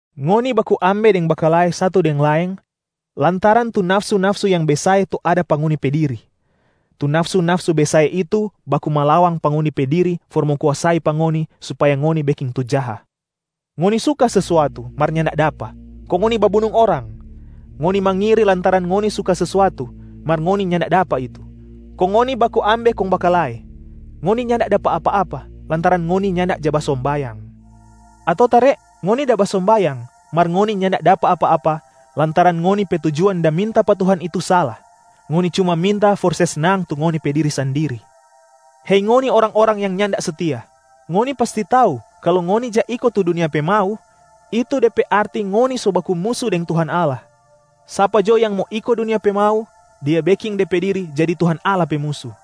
Ngoni baku ambe deng bakalae satu deng laeng lantaran tu nafsu-nafsu yang besae tu ada pa ngoni pe diri. Tu nafsu-nafsu besae itu baku malawang pa ngoni pe diri for mo kuasai pa ngoni supaya ngoni beking tu jaha. Ngoni suka sesuatu mar nyanda dapa, kong ngoni babunung orang. Ngoni mangiri lantaran ngoni suka sesuatu, mar ngoni nyanda dapa itu. Kong ngoni baku ambe kong bakalae. Ngoni nyanda dapa apa-apa lantaran ngoni nyanda ja basombayang. Ato tare ngoni da basombayang mar ngoni nyanda dapa apa-apa lantaran ngoni pe tujuan da minta pa Tuhan itu sala, ngoni cuma minta for se snang tu ngoni pe diri sandiri. Hei ngoni, orang-orang yang nyanda setia! Ngoni pasti tau kalu ngoni ja iko tu dunia pe mau, itu de pe arti ngoni so baku musu deng Tuhan Allah. Sapa jo yang mo iko dunia pe mau, dia beking de pe diri jadi Tuhan Allah pe musu.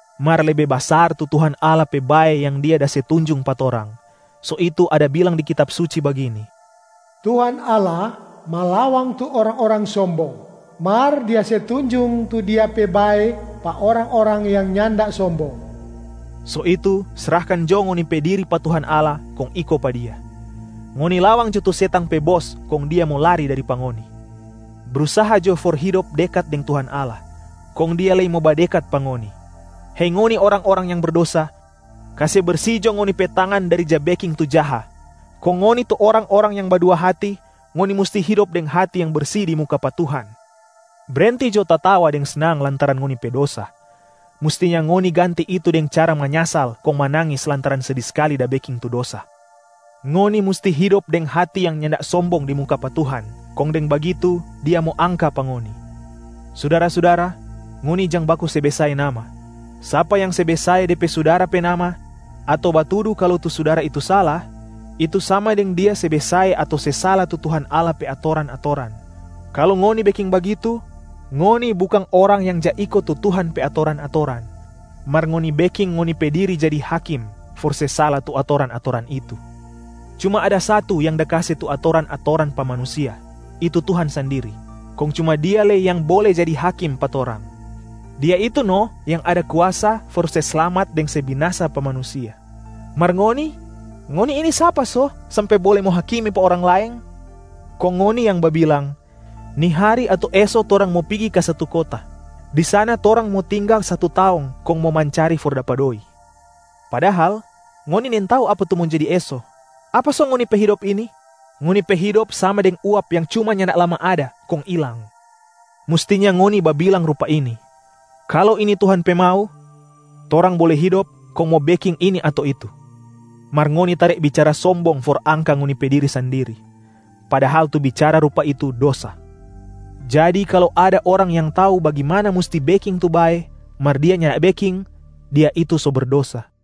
Mar lebe basar tu Tuhan Allah pe bae yang Dia da se tunjung pa torang. So itu ada bilang di Kitab Suci bagini, “Tuhan Allah malawang tu orang-orang sombong, mar Dia se tunjung tu Dia pe bae pa orang-orang yang nyanda sombong.” So itu srahkan jo ngoni pe diri pa Tuhan Allah kong iko pa Dia. Ngoni lawang jo tu setang pe bos kong dia mo lari dari pa ngoni. Brusaha jo for hidop dekat deng Tuhan Allah kong Dia lei mo badekat pa ngoni. Hei ngoni orang-orang yang berdosa, kase bersi jo ngoni pe tangan dari ja beking tu jaha! Kong ngoni tu orang-orang yang badua hati, ngoni musti hidop deng hati yang bersi di muka pa Tuhan. Brenti jo tatawa deng snang lantaran ngoni pe dosa, mustinya ngoni ganti itu deng cara manyasal kong manangis lantaran sedi skali da beking tu dosa. Ngoni musti hidop deng hati yang nyanda sombong di muka pa Tuhan, kong deng bagitu Dia mo angka pa ngoni. Sudara-sudara, ngoni jang baku se besae nama. Sapa yang se besae de pe sudara pe nama ato batudu kalu tu sudara itu sala, itu sama deng dia se besae ato se sala tu Tuhan Allah pe atoran-atoran. Kalu ngoni beking bagitu, ngoni bukang orang yang ja iko tu Tuhan pe atoran-atoran, mar ngoni beking ngoni pe diri jadi hakim for se sala tu atoran-atoran itu. Cuma ada satu yang da kase tu atoran-atoran pa manusia, itu Tuhan sandiri, kong cuma Dia lei yang bole jadi hakim pa torang. Dia itu no yang ada kuasa for se slamat deng se binasa pa manusia. Mar ngoni, ngoni ini sapa so sampe bole mo hakimi pa orang laeng? Kong ngoni yang babilang, “Ni hari ato eso torang mo pigi ka satu kota. Di sana torang mo tinggal satu taong kong mo mancari for dapa doi.” Padahal, ngoni nintau apa tu mo jadi eso. Apa so ngoni pe hidop ini? Ngoni pe hidop sama deng uap yang cuma nyanda lama ada kong ilang. Mustinya ngoni babilang rupa ini, “Kalu ini Tuhan pe mau, torang bole hidop kong mo beking ini ato itu.” Mar ngoni tare bicara sombong for angka ngoni pe diri sandiri. Padahal tu bicara rupa itu dosa. Jadi kalu ada orang yang tau bagimana musti beking tu bae, mar dia nyanda beking, dia itu so berdosa.